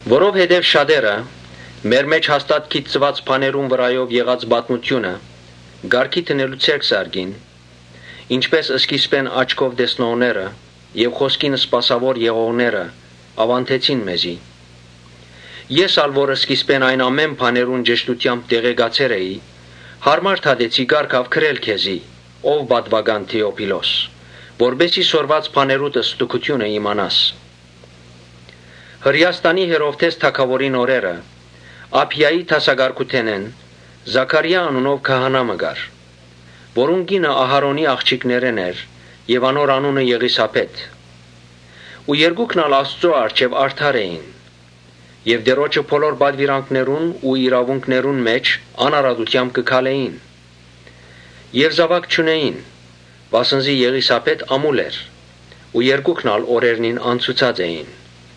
Որովհետեւ շատերը մեր մէջ հաստատ գիտցուած բաներուն վրայով եղած պատմութիւնը կարգի դնելու ձեռք զարկին, Ինչպէս սկիզբէն աչքով տեսնողները եւ խօսքին սպասաւոր եղողները աւանդեցին մեզի, Ես ալ որ սկիզբէն այն ամէն բաներուն ճշդութեամբ տեղեկացեր էի, յարմար դատեցի կարգաւ գրել քեզի, ո՛վ պատուական Թէոփիլոս, Որպէս զի սորված բաներուդ ստուգութիւնը իմանաս։ Հրէաստանի Հերովդէս թագաւորին օրերը Աբիայի դասակարգութենէն Զաքարիա անունով քահանայ մը կար, որուն կինը Ահարոնին աղջիկներէն էր եւ անունը՝ Եղիսաբէթ։ Երկուքն ալ Աստուծոյ առջեւ արդար էին եւ Տէրոջը բոլոր պատուիրանքներուն ու իրաւունքներուն մէջ անարատութեամբ կը քալէին։ Զաւակ չունէին, վասն զի Եղիսաբէթ ամուլ էր ու երկուքն ալ օրերնին անցուցած էին։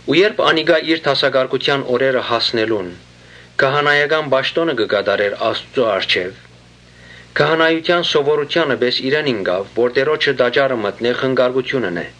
Երբ Զաքարիա իր դասակարգութեան օրերը հասնելուն քահանայական պաշտօնը կը կատարէր Աստուծոյ առջեւ, Քահանայութեան սովորութեանը պէս իրեն ինկաւ որ Տէրոջը տաճարը մտնէ եւ խնկարկութիւն ընէ։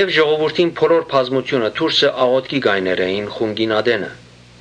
Ժողովուրդին բոլոր բազմութիւնը դուրսը աղօթքի կայներ էին խունկին ատենը։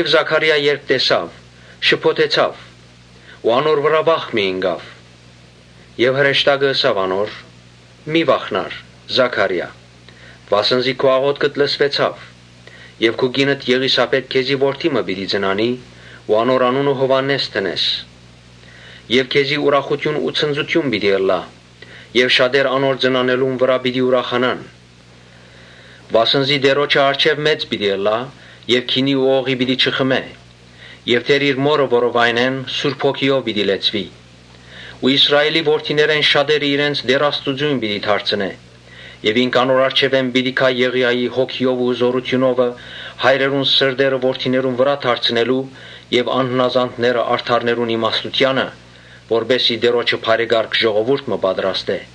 Զաքարիա երբ տեսաւ, շփոթեցաւ ու անոր վրայ վախ մը ինկաւ։ Հրեշտակը ըսաւ անոր. «Մի՛ վախնար, Զա՛քարիա, վասն զի քու աղօթքդ լսուեցաւ։ Քու կինդ Եղիսաբէթ քեզի որդի մը պիտի ծնանի ու Անոր անունը Այսինքն, Տէրոջը շնորհքըՅովհաննէս պիտի դնես։ Քեզի ուրախութիւն ու ցնծութիւն պիտի ըլլայ եւ շատեր անոր ծնանելուն համար պիտի ուրախանան։ Վասն զի Տէրոջը առջեւ մեծ պիտի ըլլայ։ Բայց գինի եւ օղի պիտի չխմէ եւ իր մօրը որովայնէն Սուրբ Հոգիով պիտի լեցուի. Իսրայէլի որդիներէն շատերը իրենց Տէր Աստուծոյն պիտի դարձնէ։ Ինք անոր առջեւէն պիտի գայ Եղիային հոգիովը ու զօրութիւնովը, հայրերուն սրտերը որդիներուն վրայ դարձնելու եւ անհնազանդները՝ արդարներուն իմաստութեանը, որպէս զի Տէրոջը բարեկարգ ժողովուրդ մը պատրաստէ»։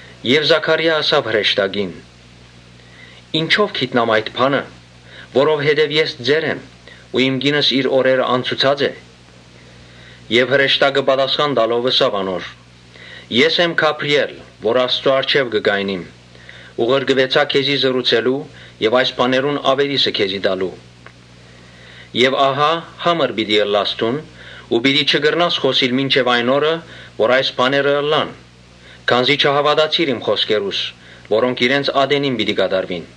Զաքարիա ըսաւ հրեշտակին. «Ինչո՞վ գիտնամ այդ բանը, որովհետեւ ես ծեր եմ ու իմ կինս իր օրերը անցուցած է»։ Հրեշտակը պատասխան տալով ըսաւ անոր. «Ես եմ Գաբրիէլը, որ Աստուծոյ առջեւ կը կայնիմ ու ղրկուեցայ քեզի խօսելու եւ այս բաներուն աւետիսը քեզի տալու։ Ահա համր պիտի ըլլաս դուն ու պիտի չկրնաս խօսիլ մինչեւ այն օրը՝ երբ այս բաները ըլլան, քանզի չհաւատացիր իմ խօսքերուս, որոնք իրենց ատենին պիտի կատարուին»։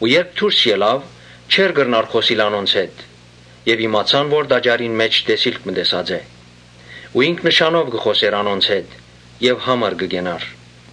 Երբ դուրս ելաւ, չէր կրնար խօսիլ անոնց հետ. ասով իմացան թէ տաճարին մէջ տեսիլք մը տեսած է։ Ինք նշանով կը խօսէր անոնց հետ եւ համր կը կենար։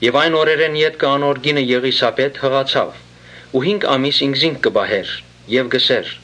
Այն օրերէն ետքը անոր կինը Եղիսաբէթ յղացաւ ու հինգ ամիս ինքզինք կը պահէր եւ կ’ըսէր.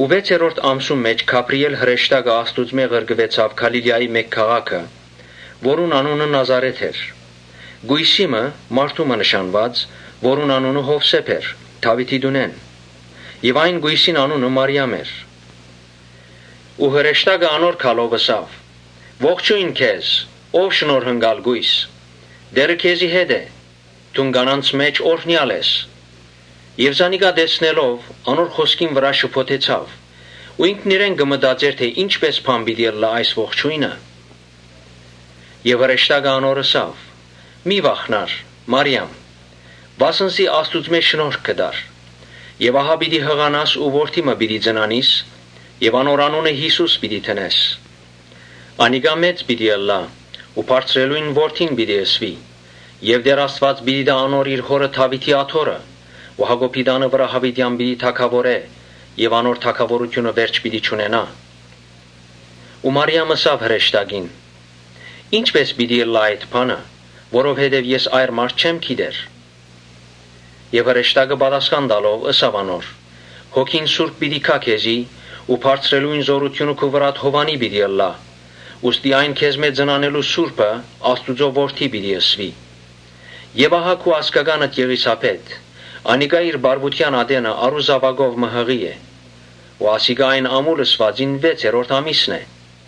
Վեցերորդ ամսուն մէջ Գաբրիէլ հրեշտակը Աստուծմէ ղրկուեցաւ Գալիլիայի մէկ քաղաքը՝ որուն անունը Նազարէթ էր, Կոյսի մը՝ մարդու մը նշանուած, որուն անունը Յովսէփ էր, Դաւիթին տունէն։ Այն կոյսին անունը Մարիամ էր։ Հրեշտակը անոր երթալով՝ ըսաւ. «Ողջոյն քեզ, ո՛վ շնորհընկալ կոյս, Տէրը քեզի հետ է։ Դուն կիներուն մէջ օրհնեալ ես»։ Մարիամ զանիկա տեսնելով, անոր խօսքին վրայ շփոթեցաւ ու ինքնիրեն կը մտածէր թէ ի՞նչպէս բան պիտի ըլլայ այս ողջոյնը։ Հրեշտակը անոր ըսաւ. «Մի՛ վախնար, Մա՛րիամ, վասն զի Աստուծմէ շնորհք գտար։ Ահա պիտի յղանաս ու որդի մը պիտի ծնանիս եւ անոր անունը Յիսուս պիտի դնես։ Անիկա մեծ պիտի ըլլայ ու Բարձրեալին Որդի պիտի կոչուի։ Տէր Աստուած անոր պիտի տայ իր հօրը Դաւիթին աթոռը ու Յակոբին տանը վրայ յաւիտեան պիտի թագաւորէ։ Անոր թագաւորութիւնը վերջ պիտի չունենայ»։ Մարիամ ըսաւ հրեշտակին. «Ի՞նչպէս պիտի ըլլայ այդ բանը, որովհետեւ ես այր մարդ չեմ գիտեր»։ Հրեշտակը պատասխան տալով՝ ըսաւ անոր. «Սուրբ Հոգին պիտի գայ քեզի ու Բարձրեալին զօրութիւնը քու վրադ հովանի պիտի ըլլայ. ուստի այն քեզմէ ծնանելու սուրբը Աստուծոյ Որդի պիտի կոչուի։ Ահա քու ազգականդ Եղիսաբէթ՝ անիկա ալ իր պառաւութեան ատենը արու զաւակով մը յղի է։ Ասիկա այն ամուլ ըսուածին վեցերորդ ամիսն է,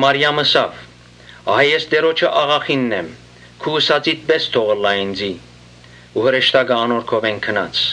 Մարիամ ըսաւ. «Ահա ես Տէրոջը աղախինն եմ, քու ըսածիդ պէս թող ըլլայ ինծի»։ Ու հրեշտակը անոր քովէն գնաց։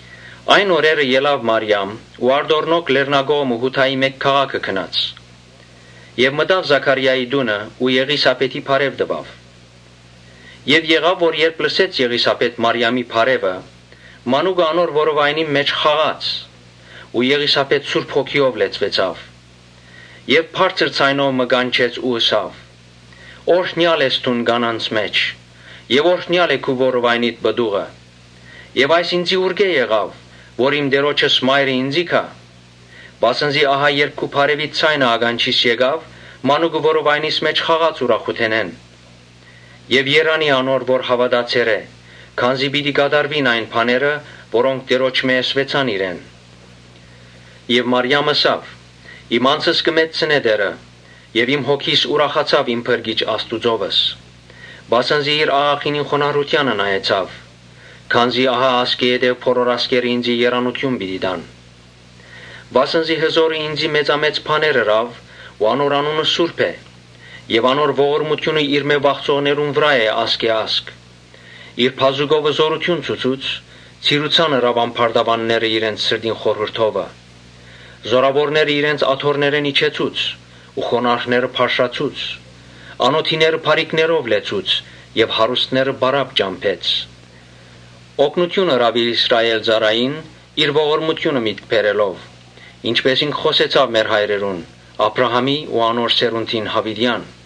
Այն օրերը ելաւ Մարիամ ու արտորալով լեռնակողմը Յուդայի մէկ քաղաքը գնաց։ Մտաւ Զաքարիային տունը ու Եղիսաբէթին բարեւ տուաւ։ Երբ Եղիսաբէթ Մարիամին բարեւը լսեց, մանուկը անոր որովայնին մէջ խաղաց ու Եղիսաբէթ Սուրբ Հոգիով լեցուեցաւ, Եւ բարձր ձայնով մը կանչեց ու ըսաւ. «Օրհնեալ ես դուն կիներուն մէջ եւ օրհնեալ է քու որովայնիդ պտուղը։ Այս ինծի ինչպէ՞ս եղաւ, որ իմ Տէրոջս մայրը ինծի եկաւ։ Վասն զի ահա երբ քու բարեւիդ ձայնը ականջիս հասաւ, մանուկը որովայնիս մէջ խաղաց ուրախութենէն։ Երանի՜ անոր որ Կամ, հաւատացեր է թէհաւատացեր է, քանզի՝ ՝ պիտի կատարուին այն բաները, որոնք Տէրոջմէն ըսուեցան իրեն»։ Մարիամ ըսաւ. «Իմ անձս կը մեծցնէ Տէրը։ Եւ իմ հոգիս ուրախացաւ իմ Փրկիչ Աստուծմովս։ Վասն զի իր աղախինին խոնարհութեանը նայեցաւ. քանզի ահա ասկէ ետք բոլոր ազգերը ինծի երանութիւն պիտի տան։ Վասն զի Հզօրը ինծի մեծամեծ բաներ ըրաւ ու անոր անունը սուրբ է։ Եւ անոր ողորմութիւնը իրմէ վախցողներուն վրայ է ազգէ ազգ։ Իր բազուկովը զօրութիւն ցուցուց, ցիրուցան ըրաւ ամբարտաւանները իրենց սրտին խորհուրդովը։ Զօրաւորները իրենց աթոռներէն իջեցուց ու խոնարհները բարձրացուց։ Անօթիները բարիքներով լեցուց եւ հարուստները պարապ ճամբեց։ Օգնութիւն ըրաւ իր Իսրայէլ ծառային՝ իր ողորմութիւնը միտքը բերելով, Ինչպէս ինք խօսեցաւ մեր հայրերուն, Աբրահամին ու անոր սերունդին յաւիտեան»։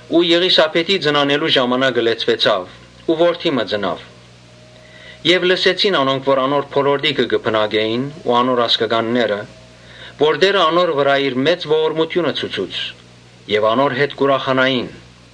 Ու Եղիսաբէթին ծնանելու ժամանակը լեցուեցաւ ու որդի մը ծնաւ։ Երբ լսեցին անոնք, որ անոր բոլորտիքը կը բնակէին ու անոր ազգականները, որ Տէրը անոր վրայ իր մեծ ողորմութիւնը ցուցուց, անոր հետ ուրախացան։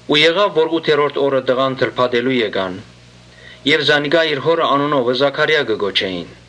Ութերորդ օրը տղան թլփատելու գացին եւ զանիկա իր հօրը անունովը Զաքարիա կը կոչէին,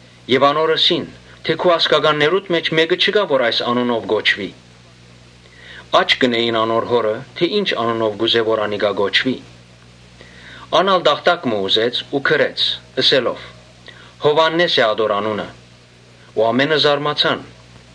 Անոր ըսին թէ՝ ‘Քու ազգականներուդ մէջ մէկը չկայ, որ այս անունով կոչուի’։ Աչք ըրին անոր հօրը թէ ի՞նչ անունով կ’ուզէ որ անիկա կոչուի։ Ան ալ տախտակ մը ուզեց ու գրեց. «Յովհաննէս է ատոր անունը»։ Ամէնքն ալ զարմացան։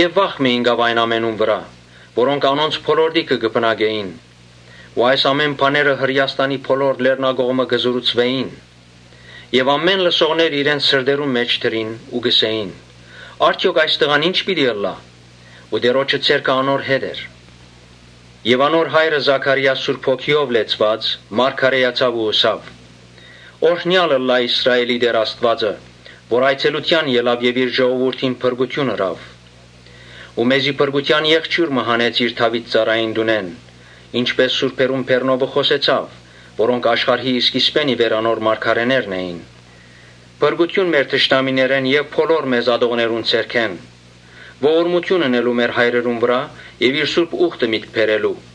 Վախ մը ինկաւ այն ամենուն վրայ՝ որոնք անոնց բոլորտիքը կը բնակէին։ Այս բաները Հրէաստանի բոլոր լեռնակողմը կը պատմուէր։ Բոլոր լսողները իրենց սրտերնուն մէջ կը խորհէին ու կ’ըսէին. «Արդեօք այս տղան ի՞նչ պիտի ըլլայ»։ Տէրոջը ձեռքը անոր հետ էր։ Անոր հայրը Զաքարիա՝ Սուրբ Հոգիով լեցուած՝ մարգարէացաւ ու ըսաւ. «Օրհնեալ ըլլայ Իսրայէլին Տէր Աստուածը, որ այցելութեան ելաւ եւ իր ժողովուրդին փրկութիւն ըրաւ։ Մեզի փրկութեան եղջիւր մը հանեց իր Դաւիթ ծառային տունէն. (Ինչպէս խօսեցաւ սուրբերուն բերնովը, որոնք աշխարհի սկիզբէն ի վեր անոր մարգարէներն էին.) Փրկութիւն մեր թշնամիներէն եւ բոլոր մեզ ատողներուն ձեռքէն, Ողորմութիւն ընելու մեր հայրերուն եւ իր սուրբ ուխտը միտք բերելու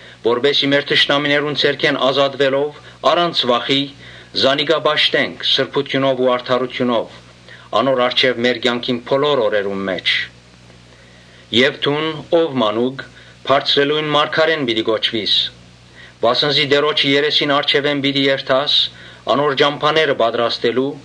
Որպէս զի մեր թշնամիներուն ձեռքէն ազատուելով՝ առանց վախի զանիկա պաշտենք Սրբութիւնով ու արդարութիւնով անոր առջեւ մեր կեանքին բոլոր օրերուն մէջ։ Եւ ‘Դո՛ւն, ո՛վ մանուկ, Բարձրեալին մարգարէն պիտի կոչուիս, վասն զի Տէրոջը երեսին առջեւէն պիտի երթաս՝ անոր ճամբաները պատրաստելու,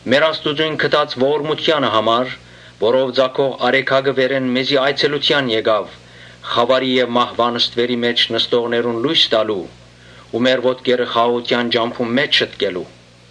Մեր Աստուծոյն գթած ողորմութեանը համար, որով Ծագող արեգակը վերէն մեզի այցելութեան եկաւ՝ ‘Խաւարի եւ մահուան ստուերի մէջ նստողներուն լոյս տալու’ ու մեր ոտքերը խաղաղութեան ճամբուն մէջ շտկելու»։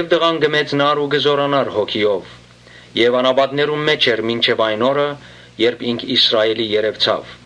Տղան կը մեծնար ու կը զօրանար հոգիով եւ անապատներուն մէջ էր մինչեւ այն օրը, երբ ինք Իսրայէլին երեւցաւ։